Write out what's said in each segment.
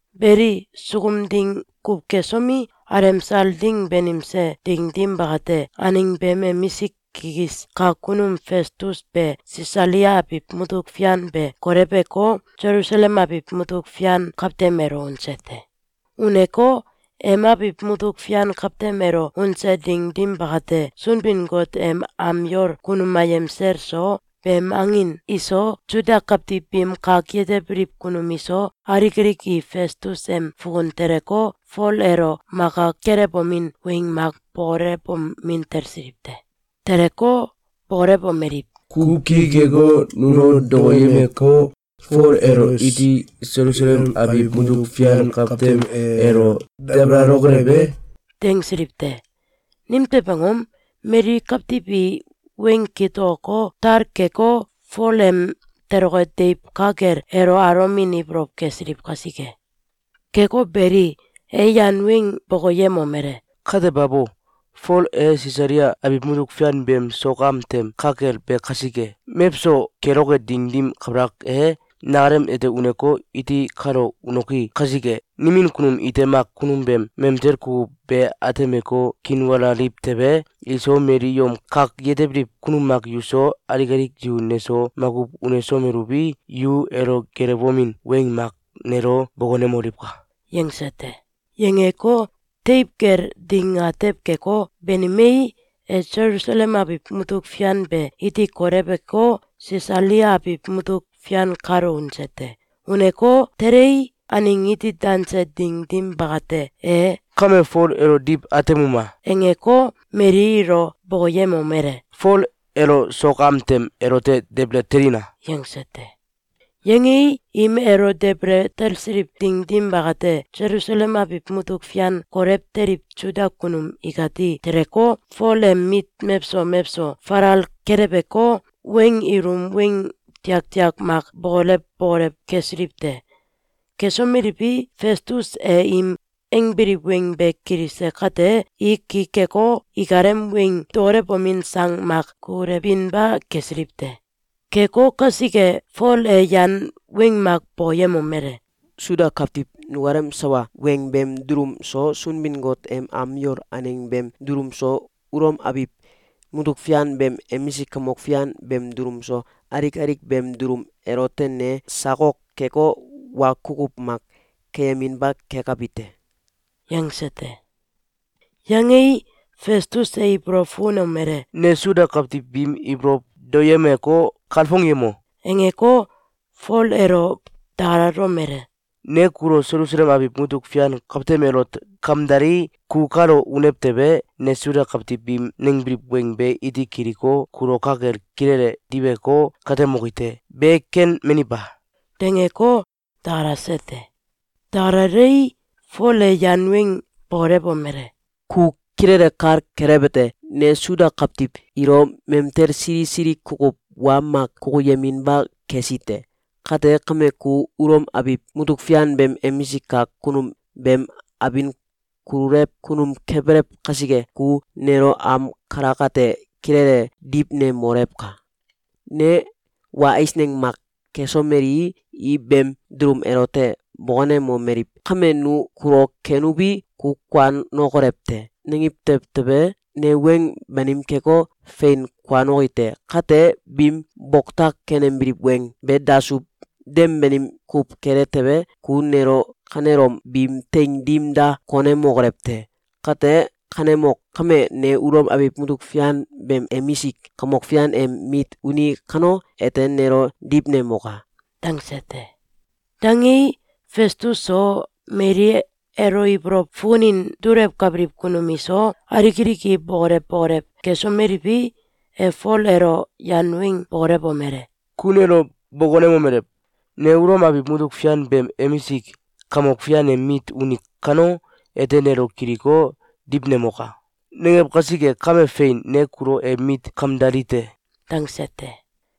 Beli, sukum ding kuw kesomi, alemsal ding banimse ding dim bakate, aneng beem emisik kikis kak kunum Festus be Sisalia abiw mutuk fian be koleweko, Selusalem abiw mutuk fian kawtem elo unse te. Uneko, em abiw mutuk fian kawtem elo unse ding dim bakate, Sunbin-Got em am yol kunum ayem sel so, beem angin iso, Suda kawtiw biim kak yetebiliw kunum iso, alik alik i Festus em fukun teleko, Fol elo maka kelewomin weng mak bokolewomin talsiliw te. Teleko, bokolewomeliw: “Ku ki keko, nulo dokoyemeko, Fol elo iti Selusalem abiw mutuk fian kawtem elo dabalalokolew e?”, dangsiliw te. Nimtew angom? Mali kawtiw i weng kitokoko, tal keko, Fol em toloke deiw ka kel elo alomin ibolow kesiliw kasike. Keko beli, e yan weng bokoyemomele: “Kate babo! Fol e Sisalia abiw mutuk fian beem sok am tem ka kel be kasike! Mewso keloke ding dim kabalak e, nakalem ete uneko, iti kalo unoki kasike, nimin kunum ite mak kunum beem mamtel kukuw be atemeko, kiinwalaliw tewe, iso, mali yom kak yetebiliw kunum mak yuso, alik alik yu neso makuw unesomeluwi, yu elo geelewomin weng mak nelo bokonemoliwka!”, yangse te. Yangeko, teiw kel ding atew keko, banimei, e Selusalem abiw mutuk fian be iti koleweko, Sisalia abiw mutuk fian kalo unse te. Uneko, telei, aneng iti danse ding dim bakate, e “Kame Fol elo diw atemuma!”, angeko, mali ilo bokoyemomele: “Fol elo sok am tem elote debele telina!”, yangse te. Yangei, im elo debele talsiliw ding dim bakate, Selusalem abiw mutuk fian kolew teliw Suda kunum ikati teleko, Fol em mit mewso mewso falal keleweko, weng ilum weng tiak tiak mak bokolew bokolew kesiliw te. Kesomeliwi, Festus e im angbiliw weng be kilise kate, i ki keko, ikalem weng dokolewomin sang mak kukulewinba kesiliw te. Keko kasike, Fol e yan weng mak bokoyemomele: “Suda kawtiw nukalem sawa weng beem dulum so, Sunbin-Got em am yol aneng beem dulum so, Ulom abiw mutuk fian beem emisik kamok fian beem dulum so, alik alik beem dulum elote ne sakok keko, wa kukuw mak keyeminba kekabi te.”, yangse te. Yangei, Festus e ibolow fukunomele: “Ne Suda kawtiw biim ibolow daoyemeko, kalfongyemo!”, angeko, Fol elo dakalalomele: “Ne kulo Selusalem abiw mutuk fian kawtem elot kamdalii, ku kalo unew tewe, ne Suda kawtiw biim nangbiliw weng be iti kiliko, kulo ka kel kilele diweko, katemoki te. Be ken mani ba?”, dangeko, dakalase te. Dakalalei, Fol e yan weng bokolewomele: “Ku kilele kal kelewete: Ne Suda kawtiw ilo mamtel sili sili kukuw wa mak kukuyeminba kesi te. Kate kame, ku Ulom abiw mutuk fian beem emisik kak kunum beem abin kululew kunum kebelew kasike, ku nelo am kalakate kilele diwnemolewka! Ne wa eisneng mak kesomelii, i beem dulum elote bokonemomeliw: ‘Kame nu kulo kenuwi, ku kuanokolew te!’, nangiw tew tewe, ne weng banim keko, fein kuanoki te. Kate, biim boktak kenembiliw weng be dasuw, dem banim kuw kele tewe, ku nelo kanelom biim teing dim da konemokolew te! Kate kanemok! Kame, ne Ulom abiw mutuk fian beem emisik kamok fian em mit uni kano, ete nelo diwnemoka!”, dangse te. Dangei, Festus so, mali elo ibolow fukunin dulewkabiliw kunum iso, alik alik i bokolew bokolew kesomeliwi, e Fol elo yan weng bokolewomele: “Ku nelo bokonemomelew: ‘Ne Ulom abiw mutuk fian beem emisik kamok fian em mit uni kano, ete nelo kiliko, diwnemoka!’, nangew kasike, kame fein, ne kulo em mit kamdali te!”, dangse te.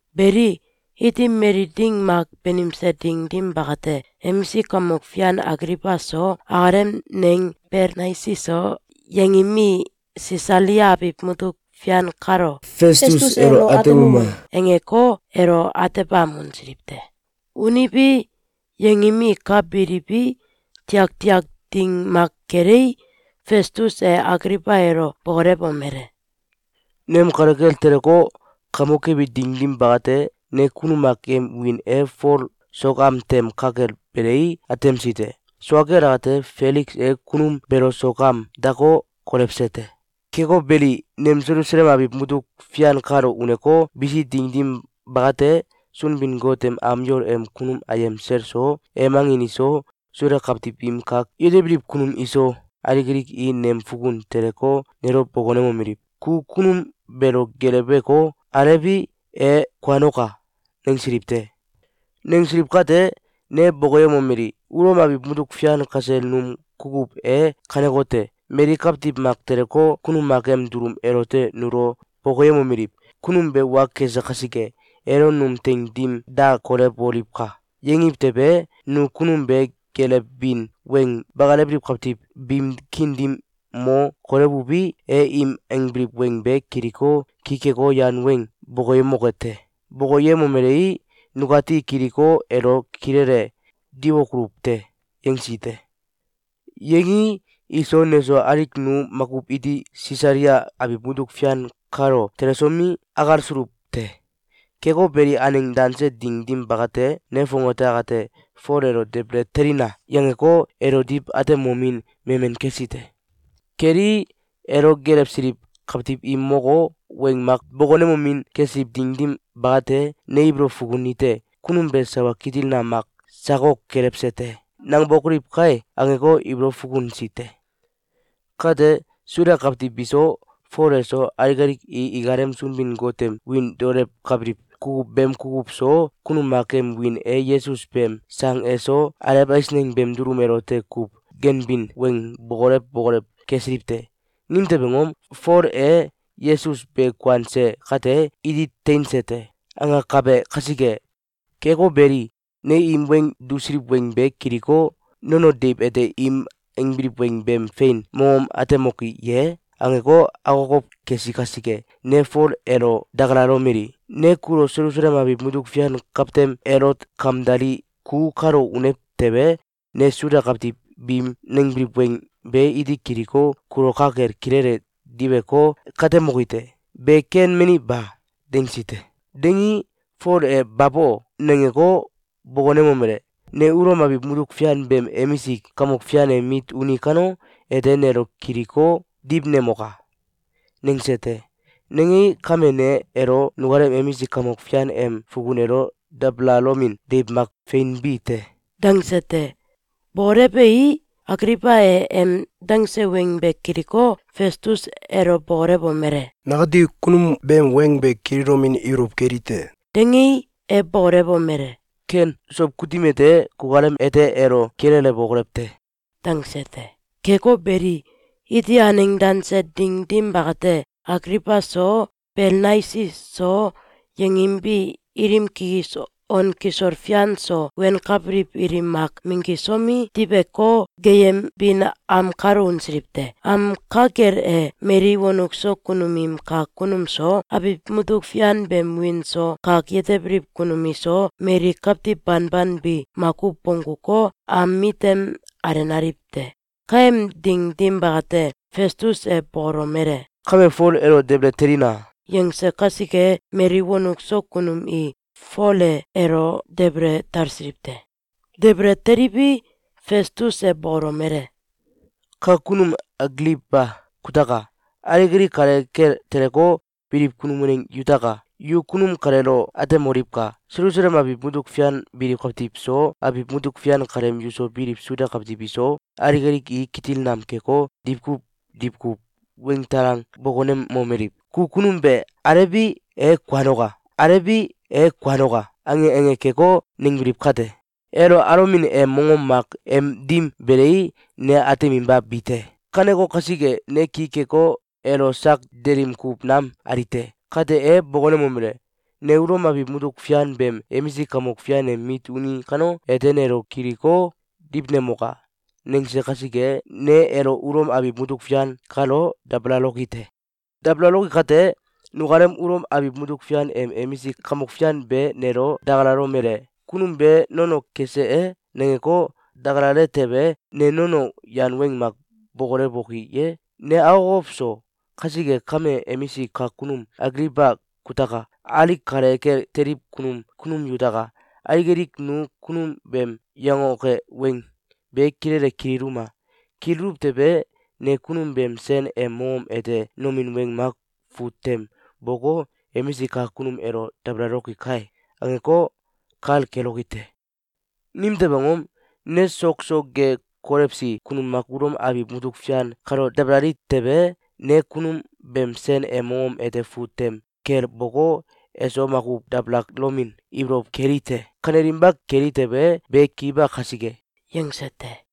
Beli, iti mali ding mak banimse ding dim bakate, emisik kamok fian Agliwba so, akalem neng Belnaisi so, yangim i Sisalia abiw mutuk fian kalo “Festus elo atemuma!”, angeko, elo atebam unsiliw te. Uniwi, yangim i ka biliwi, tiak tiak ding mak kelei, Festus e Agliwba elo bokolewomele: “Nem kale kel teleko, kamok kebi ding dim bakate, ne kunum mak em wiin e Fol sok am tem ka kel belei, atemsi te. Sua kel akate, Feliks e kunum beelo sok am dako, kolewse te. Keko beli, nem Selusalem abiw mutuk fian kalo uneko, bisi ding dim bakate, Sunbin-Got em am yol em kunum ayem sel so, em angin iso, Suda kawtiw im kak yetebiliw kunum iso, alik alik i nem fukun teleko, nelo bokonemomeliw: ‘Ku kunum beelo geeleweko, alewi, e kuanoka!’, nangsiliw te. Nangsiliw kate, ne bokoyemomeli: ‘Ulom abiw mutuk fian kasel num kukuw e kanekote: Mali kawtiw mak teleko, kunum mak em dulum elote nulo bokoyemomeliw: ‘Kunum be wa kese kasike, elo num teing dim da kolewoliwka!’, yangiw tewe, nu kunum be geelewbin weng bakalewbiliw kawtiw biim kiin dim mo kolewuwi, e im angbiliw weng be kiliko, ki keko, yan weng bokoyemoke te. Bokoyemomelei, nukati kiliko, elo kilele diwokoluw te.’, yangsi te. Yangii, iso neso, alik nu makuw iti Sisalia abiw mutuk fian kalo telesomi, akalsuluw te. Keko beli, aneng danse ding dim bakate, ne fongate akate ‘Fol elo debele telina!’, yangeko, elo diw atemomin memen kesi te. Kelii, elo geelewsiliw kawtiw im moko, weng mak bokonemomin kesiliw ding dim bakate, ne ibolow fukunite: “Kunum be sawa kitil nam mak sakok kelewse te!’, nangbokoliw kai!’, angeko, ibolow fukunsi te. Kate, Suda kawtiw biso, Fol eso, alik alik i ikalem Sunbin-Got em wiin daolewkabiliw kukuw beem kukuw so, kunum mak em wiin e Yesus beem sang eso, alew eisneng beem dulum elote kuw ganbin weng bokolew bokolew kesiliw te. Nimtew angom? Fol e ‘Yesus be kuanse kate, iti teinse te!’, angakabe kasike. Keko beli, ne im weng dusiliw weng be kiliko, ‘Nono deiw ete im angbiliw weng beem fein mongom atemoki ye?’, angeko, akokow kesi kasike, ne Fol elo dakalalomeli: ‘Ne kulo Selusalem abiw mutuk fian kawtem elot kamdalii, ku kalo unew tewe, ne Suda kawtiw biim nangbiliw weng be iti kiliko, kulo ka kel kilele diweko, katemoki te. Be ken mani ba?’, dangsi te. Dangii, Fol e ‘Babo!’, nangeko, bokonemomele: ‘Ne Ulom abiw mutuk fian beem emisik kamok fian em mit uni kano, ete nelo kiliko, diwnemoka!’, nangse te. Nangei, kame ne elo nukalem emisik kamok fian em fukun elo dabalalomin deiw mak feinbi te.”, dangse te. Bokolewei, Agliwba e em dangse weng be kiliko, Festus elo bokolewomele: “Nakati kunum beem weng be kililomin ibolow keli te.”, dangei, e bokolewomele: “Ken. Sow kutim ete, kukalem ete elo kililewokolew te.”, dangse te. Keko beli, iti aneng danse ding dim bakate, Agliwba so, Belnaisi so, yangim bi ilim kikis on kisol fian so wenkabiliw ilim mak minggisomi, diweko, geeyembin am kalo unsiliw te. Am ka kel e, mali wonuk so kunum im kak kunum so, abiw mutuk fian beem wiin so kak yetebiliw kunum iso, mali kawtiw banban bi makuw bongguko, am mitem alenaliw te. Kaem ding dim bakate, Festus e bokolomele: “Kame, Fol elo debele telina!”, yangse kasike, mali wonuk so kunum i Fole elo debele talsiliw te. Debele teliwi, Festus e bokolomele: “Kak kunum Agliwba kutaka! Alik alik kale kel teleko, biliw kunum waneng yutaka! Yu kunum kaleelo atemoliwka! Selusalem abiw mutuk fian biliw kawtiw so, abiw mutuk fian kaleem yuso biliw Suda kawtiw iso, alik alik i kitil nam keko, diwkuw diwkuw weng talang bokonemomeliw: ‘Ku kunum be alewi, e kuanoka! Alewi, e kuanoka!’, ange ange keko, nangbiliw kate, elo alomin em mongom mak em dim belei, ne ateminba bi te. Kaneko kasike, ne ki keko, elo sak delim kuw nam ali te. Kate, e bokonemomele: ‘Ne Ulom abiw mutuk fian beem emisik kamok fian em mit uni kano, ete nelo kiliko, diwnemoka!’, nangse kasike, ne elo Ulom abiw mutuk fian kalo dabalaloki te. Dabalaloki kate, nukalem Ulom abiw mutuk fian em emisik kamok fian be nelo dakalalomele: ‘Kunum be nono kese e?’, nangeko, dakalale tewe, ne nono yan weng mak bokolewoki ye? Ne akokow so. Kasike kame, emisik kak kunum Agliwba kutaka! Alik kale kel teliw kunum yutaka! Alik alik nu kunum beem yangoke weng be kilele kililuma! Kililuw tewe, ne kunum beem sen em mongom ete nomin weng mak fut tem boko, ‘Emisik kak kunum elo dabalaloki kai!’, angeko, kal keloki te. Nimtew angom? Ne sok so ge kolewsi kunum mak Ulom abiw mutuk fian kalo dabalali tewe, ne kunum beem sen em mongom ete fut tem kel boko, eso makuw dabalalomin ibolow keli te. Kanelinba keli tewe, be ki ba kasike.”, yangse te.